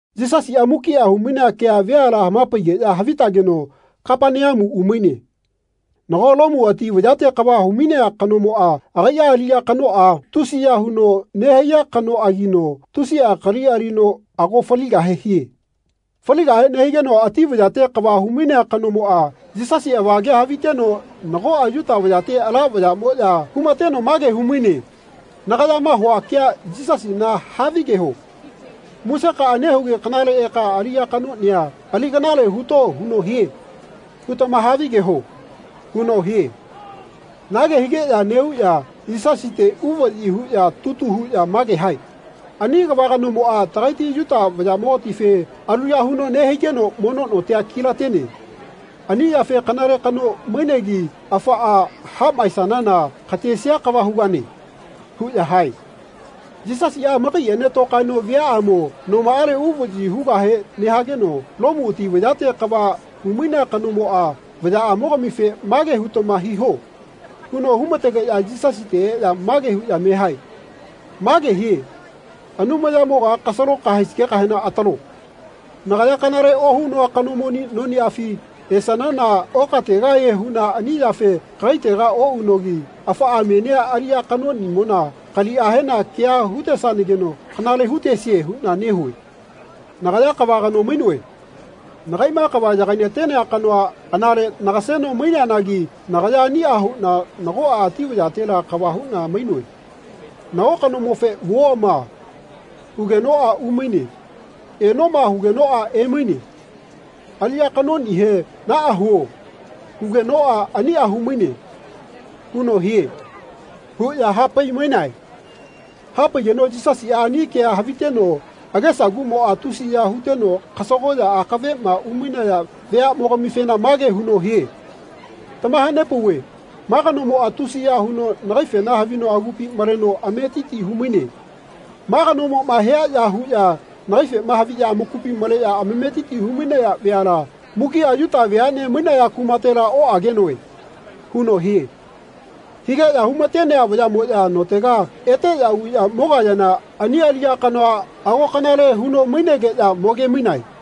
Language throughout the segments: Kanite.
Yisasiꞌa mukiꞌa humainea kea veala hamapaigeꞌya havitageno Kapaneamu umaine. Nago Lomu ati vayate kava humainea kanomoꞌa agaiꞌa aliꞌya kanoꞌa tusiya huno nehaiya kanoꞌagino tusiꞌa kali alino ago faligahe hie. Faligahe nehigeno ati vayate kava humainea kanomoꞌa Yisasi avagea haviteno nagoꞌa Yuta vayate ala vayaꞌmoꞌya humateno mage humaine “Nagayama hua kea Yisasina havigeho ‘Musekaꞌa nehugi kanale eka aliꞌya kanoꞌnia ali kanale huto huno hie.’ hutama havigeho.” huno hie. Nage higeꞌya neꞌuꞌya Yisasite uvaꞌyi huꞌya tutu huꞌya mage hae “Ani kava kanomoꞌa tagaiti Yuta vayaꞌmogatife aluya huno nehaigeno mono notia kilatene. Ani yafe kanale kano mainegi afaꞌa haꞌmaisanana katesia kava hugane.” huꞌya hae. Yisasiꞌa amakaiꞌene tokaeno viaꞌamo nomaꞌale uvaꞌyi hugahe nehageno Lomu ati vayate kava humainea kanomoꞌa vayaꞌamogamife “Mage hutama hiho.” huno humategeꞌya Yisasite eꞌya mage huꞌya mehae “Mage hie ‘Anumayamoga kasalo kahaesigekahena atalo. Nagaya kanale ohunoa kanomoni noniꞌafi esanana okategahie huꞌna ani yafe kagaitega oꞌunogi afaꞌa menia aliꞌya kanoꞌnimona kaliꞌahena keꞌa hutesanageno kanale hutesie huꞌna nehue. Nagaya kava kano mainoe. Nakaiꞌma kava yagainatenea kanoa anale nagaseno maineanagi nagaya aniꞌa huꞌna nagoꞌa ati vayatela kava huꞌna mainoe. Nago kanomofe ‘Vuoma.’ hugenoꞌa umaine. ‘Enoma.’ hugenoꞌa emaine. Aliꞌya kanoꞌnihe ‘Naꞌa huo.’ hugenoꞌa aniꞌa humaine.’ huno hie.” huꞌya hapaimainae. Hapaigeno Yisasiꞌa ani kea haviteno agesaguꞌmoꞌa tusiya huteno kasagoꞌya akaveꞌma umainaya veaꞌmogamifena mage huno hie “Tamahanepauve ma kanomoꞌa tusiya huno nagaifena havino agupi maleno ametiti humaine. Ma kanomoꞌma hia ya huꞌya nagaifema haviꞌya amakupi maleꞌya ametiti humainaya veala mukiꞌa Yuta veaꞌne mainaya kumatela oꞌagenoe.” huno hie. Higeꞌya humatenea vayaꞌmoꞌya notega eteꞌya uꞌya mogayana ani aliꞌya kanoa ago kanale huno mainegeꞌya mo gemainae.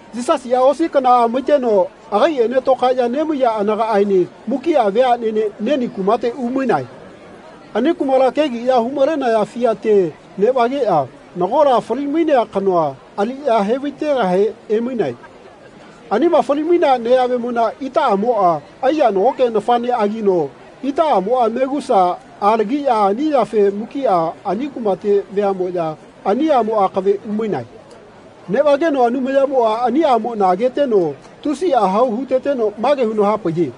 Yisasiꞌa osi kanaꞌa maiteno agaiꞌene tokaeꞌya nemaiya anagaꞌaene mukiꞌa veaꞌnene Neni kumate umainae. Ani kumala kegiꞌya humalenaya fiate neꞌvageꞌya nagola falimainea kanoa aliꞌya hevaitegahe emainae. Anima falimainea neyamona itaꞌamoꞌa aiya nagoke nafaꞌneꞌagino itaꞌamoꞌa megusa alagiꞌya ani yafe mukiꞌa ani kumate veaꞌmoꞌya ani aꞌmo akave umainae. Neꞌvageno Anumayamoꞌa ani aꞌmona ageteno tusiꞌa hau huteteno mage huno hapaiye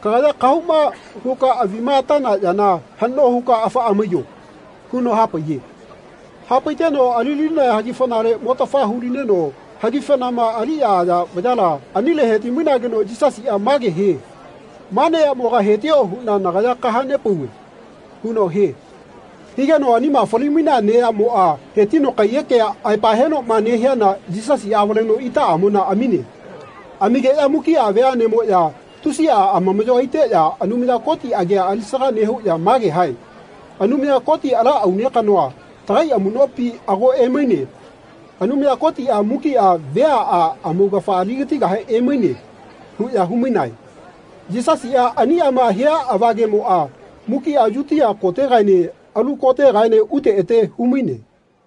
“Kagaya kahauma huka avima atana yana haꞌno huka afaꞌa maiyo.” huno hapaiye. Hapaiteno alilinaya hagifanale motafa hulineno hagifanama aliꞌya aya vayala anile hetimainageno Yisasiꞌa mage hie “Ma neyamoga hetio huꞌna nagaya kahanepauve.” huno hie. Higeno anima falimainea neyamoꞌa hetino kaiyekea aepa henoꞌma nehiana Yisasiꞌa avaleno itaꞌamona amine. Amigeꞌya mukiꞌa veaꞌnemoꞌya tusiꞌa amamaꞌyo aiteꞌya Anumaya Koti agia alisaga nehuꞌya mage hae “Anumaya Koti ala aune kanoa tagai amuꞌnopina ago emaine. Anumaya Kotiꞌa mukiꞌa veaꞌa amaugafa aligatigahe emaine.” huꞌya humainae. Yisasiꞌa aniꞌama hia avagemoꞌa mukiꞌa Yutia kotegaene alu kotegaene ute ete humaine.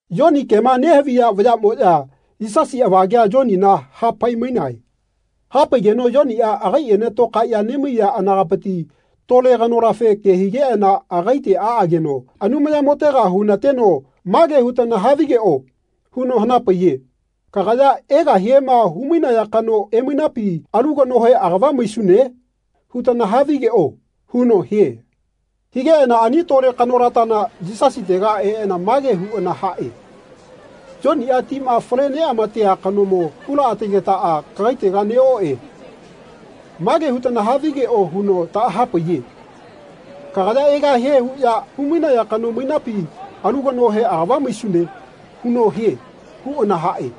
Yoni kema nehaviya vayaꞌmoꞌya Yisasi avagea Yonina hapaimainae. Hapaigeno Yoniꞌa agaiꞌene tokaeꞌya nemaiya anagapiti tole kanolafe ke higeꞌana agaite aꞌageno Anumayamotega hunateno “Mage hutana havigeꞌo.” huno hanapaiye “Kagaya egahiema humainaya kano emainapi alu kanohe agava maisune?” hutana havigeꞌo. huno hie. Higeꞌana ani tole kanolatana Yisasitega eꞌana mage huꞌana haꞌe “Yoniꞌa tima fale neꞌamatea kanomo hulaꞌategetaꞌa kagaitega neꞌoꞌe. Mage hutana havigeꞌo huno taꞌahapaiye ‘Kagaya egahie huꞌya humainaya kano mainapi alu kanohe agava maisune.’ huno hie.” huꞌana haꞌe.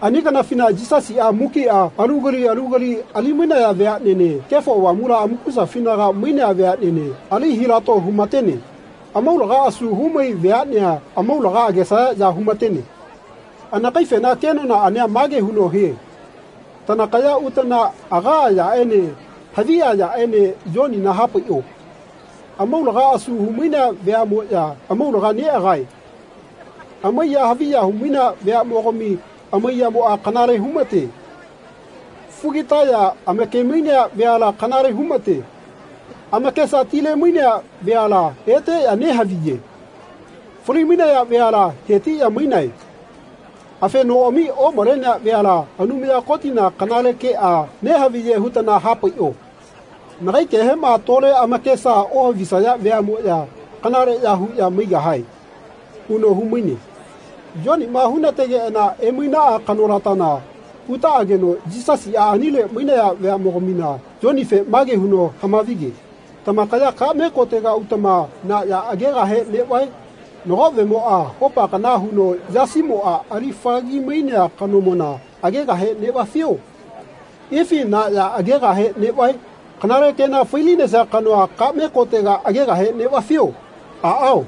Ani kanafina Yisasiꞌa mukiꞌa alu kali alu kali alimainaya veaꞌnene Kefo Avamula amakusafinaga mainea veaꞌnene ali hilato humatene. Amaulaga asu humai veaꞌnea amaulaga agesaya ya humatene. Anakaifena kenonaꞌania mage huno hie “Tanakaya utana agaꞌa yaꞌene haviꞌa yaꞌene Yonina hapaiꞌo. Amaulaga asu humainea veaꞌmoꞌya amaulaga neꞌagae. Amaiya haviya humainea veaꞌmogami amaiyamoꞌa kanale humate. Fugitaya amakemainea veala kanale humate. Amakesa tilemainea veala eteꞌya nehaviye. Falimainaya veala hetiꞌya mainae. Afenoꞌami omalenea veala Anumaya Kotina kanale keꞌa nehaviye hutana hapaiꞌo. Nagai kehema tole amakesa ohavisaya veaꞌmoꞌya kanaleꞌya huꞌya maigahae.” huno humaine. Yoniꞌma hunategeꞌana emainaꞌa kanolatana utaꞌageno Yisasiꞌa anile mainaya veaꞌmogamina Yonife mage huno hamavige “Tamakaya kaꞌme kotega utama na ya agegahe neꞌvae? Nago vemoꞌa hopa kana huno yasimoꞌa ali fagagi mainea kanomona agegahe neꞌvafio? Ifi na ya agegahe neꞌvae? Kanale kena failinesia kanoa kaꞌme kotega agegahe neꞌvafio? Aꞌao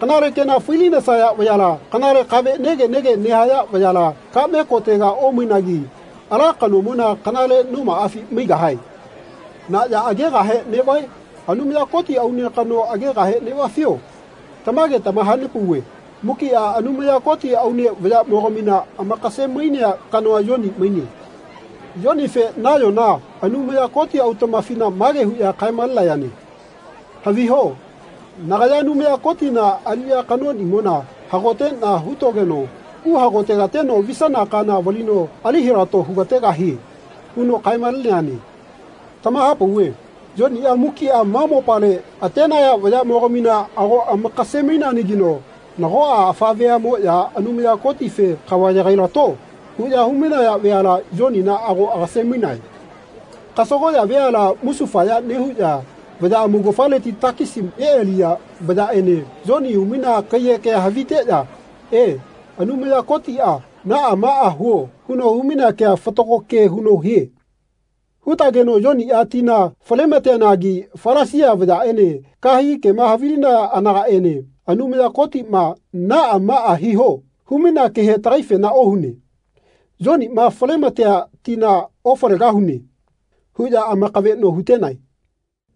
kanale kena failinesaya vayala kanale kave nege nege nehaya vayala kaꞌme kotega omainagi ala kanomona kanale nomaꞌafi maigahae. Na ya agegahe neꞌvae? Anumaya Koti aune kano agegahe neꞌvafio? Tamage tamahapauve mukiꞌa Anumaya Koti aune vayaꞌmogamina amakasemainea kanoa Yoni maine. Yonife nayona Anumaya Koti autaꞌmafina mage huꞌya kaemalenayane ‘Haviho nagaya Anumaya Kotiꞌna aliꞌya kanoꞌnimona hagoteꞌna hutogeno uhagotegateno visana kana valino ali hilato hugategahie.’ huno kaemaleneane. Tamahapauve Yoniꞌa mukiꞌa ma mopale atenaya vayaꞌmogamina ago amakasemaineanagino nagoꞌa afa veaꞌmoꞌya Anumaya Kotife ‘Kava yagailato.’ huꞌya humainaya veala Yonina ago agasemainae. Kasagoꞌya veala musufaya nehuꞌya vaya amaugafaleti takisi neꞌaliya vayaꞌene Yoni humainea kaiyekea haviteꞌya ‘E, Anumaya Kotiꞌa ‘Naꞌa maꞌa huo.’ huno humainea kea fatago ke huno hie.’ hutageno Yoniꞌa tina falemateanagi Falasia vayaꞌene kahegi kema havilinaya anagaꞌene ‘Anumaya Kotiꞌma ‘Naꞌa maꞌa hiho.’ humainea kehe tagaifena ohune.’ Yoniꞌma falematea tina ofalegahune.” huꞌya amakaveꞌno hutenae.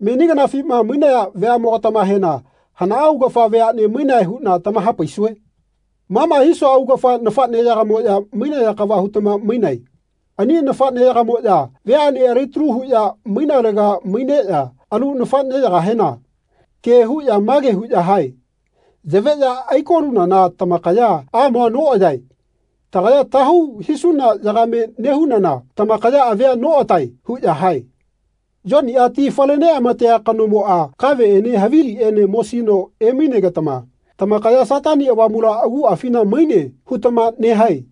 Meni kanafima mainaya veaꞌmogatamahena hana augafa veaꞌne mainae huꞌna tamahapaisue? Ma ma hisua augafa nafaꞌneyagamoꞌya mainaya kava hutama mainae. Ani nafaꞌneyagamoꞌya veaꞌne alitalu huꞌya mainalega maineꞌya alu nafaꞌneyagahena ke huꞌya mage huꞌya hae ‘Yaveꞌya aikolunana tamakaya amoa noꞌayae. Tagaya tahau hisuna yagame nehunana tamakaya avia noꞌatae.’ huꞌya hae. Yoniꞌa ti fale neꞌamatea kanomoꞌa kaveꞌene haviliꞌene mosino emainegetama tamakaya ‘Satani Avamula aguꞌafina maine.’ hutama nehae.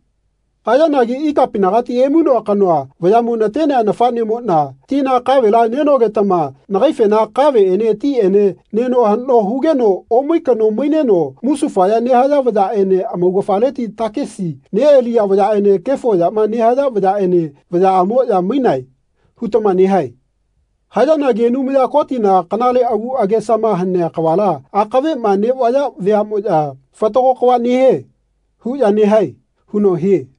Hayanagi ikapinagati emainoa kanoa vayaꞌmo natenea nafaꞌnemoꞌna tina kavela nenogetama nagaifena ‘Kaveꞌene tiꞌene neno haꞌno hugeno omai kano maineno musufaya nehaya vayaꞌene amaugafaleti takisi neꞌaliya vayaꞌene kefo yama nehaya vayaꞌene vayaꞌamoꞌya mainae.’ hutama nehae. Hayanagi Anumaya Kotiꞌna kanale agu agesama hanea kavala akaveꞌma neꞌvaya veaꞌmoꞌya ‘Fatago kava nehie.’ huꞌya nehae.” huno hie.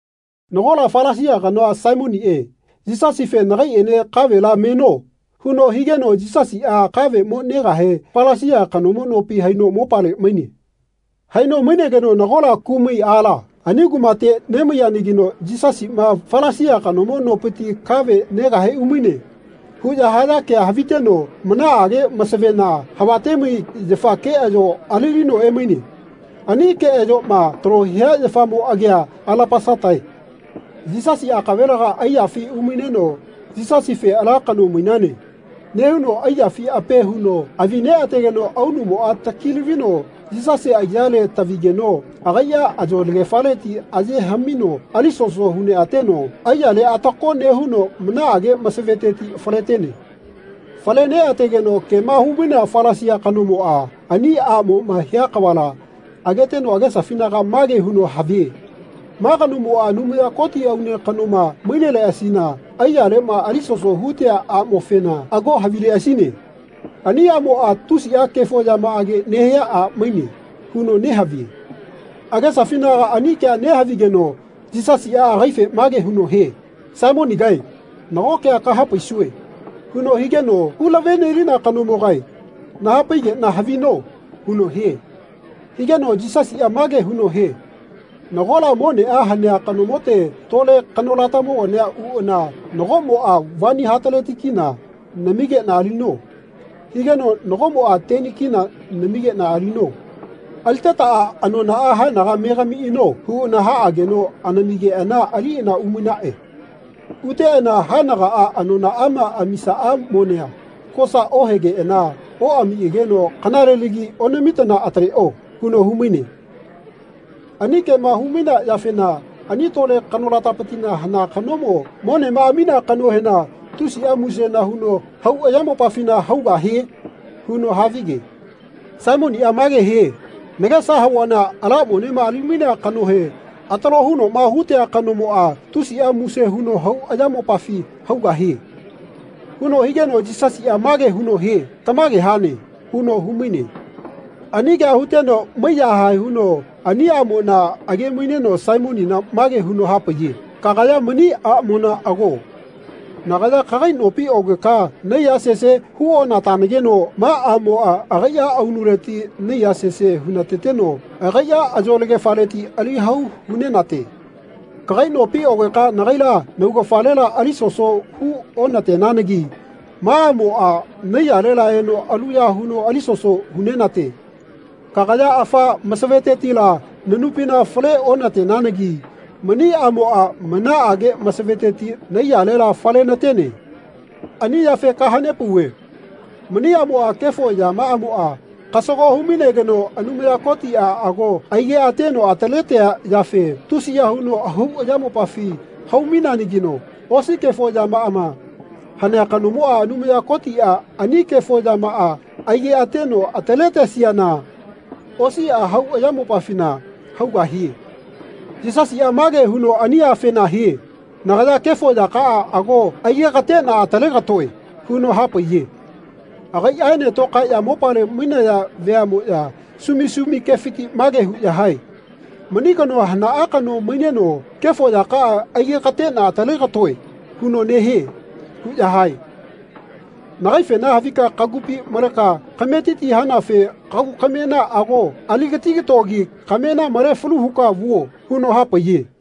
Nagola Falasia kanoa Saimoniꞌe Yisasife “Nagaiꞌene kavela meno.” huno higeno Yisasiꞌa kave mo negahe Falasia kanomo nopi haino mopale maine. Haino mainegeno nagola kumai aala ani kumate nemaiyanagino “Yisasiꞌma Falasia kanomo nopiti kave negahe umaine.” huꞌya haya kea haviteno manaꞌage masavena havatemai yafa keꞌayo alilino emaine. Ani keꞌayoꞌma talo hia yafamo agia alapasatae. Yisasi akavelega aiyafi umaineno Yisasife “Ala kano mainane.” nehuno aiyafi ape huno avi neꞌategeno aunumoꞌa takilavino Yisasi aiyale tavigeno agaiꞌa ayolagefaleti aye haꞌmino alisoso hu neꞌateno aiyale atako nehuno manaꞌage masaveteti faletene. Fale neꞌategeno kema humainea Falasia kanomoꞌa ani aꞌmoꞌma hia kavala ageteno agesafinaga mage huno havie “Ma kanomoꞌa Anumaya Koti aune kanoma maineleꞌasina aiyaleꞌma alisoso hutea aꞌmofena ago havileꞌasine. Ani aꞌmoꞌa tusiꞌa kefo yamaꞌage nehia a maine.” huno nehavie. Agesafinaga ani kea nehavigeno Yisasiꞌa agaife mage huno hie “Saimonigae nago kea kahapaisue.” huno higeno “Hulavenelina kanomogae nahapaigeꞌna havino.” huno hie. Higeno Yisasiꞌa mage huno hie “Nagola moneꞌa hanea kanomote tole kanolatamogania uꞌana nagoꞌmoꞌa ‘Vani hataleti kina (K100) namigeꞌna alino.’ higeno nagoꞌmoꞌa teni kina (K10) namigeꞌna alino. Alitetaꞌa anonaꞌa haenaga megamiꞌano huꞌana haꞌageno anamigeꞌana aliꞌana umainaꞌe. Uteꞌana haenagaꞌa anonaꞌama amisaꞌa monea kosa ohegeꞌana oꞌamiꞌageno ‘Kanalelagi onamitana ataleꞌo.’ huno humaine. Ani kema humainea yafena ani tole kanolatalapitila hana kanomo monema aminea kanohena tusia musena huno hau ayamopafina haugahie?” huno havige. Saimoniꞌa mage hie “Nagesa havuana ala monema alimainea kanohe atalo hunoꞌma hutea kanomoꞌa tusiꞌa muse huno hau ayamopafi haugahie.” huno higeno Yisasiꞌa mage huno hie “Tamage hane.” huno humaine. Ani kea huteno maiyahae huno ani aꞌmona agemaineno Saimonina mage huno hapaiye “Kagaya mani aꞌmona ago. Nagaya kagai nopi ogeka naiya sese huonatanageno ma aꞌmoꞌa agaiꞌa aunuleti naiya sese hunateteno agaiꞌa ayolagefaleti ali hau hunenate. Kagai nopi ogeka nagaila naugafalela alisoso hu onatenanagi ma aꞌmoꞌa naiyalela eno aluya huno alisoso hunenate. Kagaya afa masavetetila nanupina fale onatenanagi mani aꞌmoꞌa manaꞌage masaveteti naiyalela falenatene. Ani yafe kahanepauve mani aꞌmoꞌa kefo yamaꞌamoꞌa kasago humainegeno Anumaya Kotiꞌa ago aigeꞌateno ataletea yafe tusiya huno hau ayamopafi haumaineanagino osi kefo yamaꞌama hanea kanomona Anumaya Kotiꞌa ani kefo yamaꞌa aigeꞌateno ataletesiana osiꞌa hau ayamopafina haugahie.” Yisasiꞌa mage huno ani afena hie “Nagaya kefo yakaꞌa ago aigekateꞌna atalegatoe.” huno hapaiye. Agaiꞌaene tokaeꞌya mopale mainaya veaꞌmoya sumi sumi kefiti mage huꞌya hae “Mani kanoa hanaꞌa kano maineno ‘Kefo yakaꞌa aigekateꞌna atalegatoe.’ huno nehie.” huꞌya hae. “Nagaifena havika kagupi maleꞌka kametiti hanafe kagu kamena ago aligatigatogi kamena male falu huka vuo.” huno hapaiye.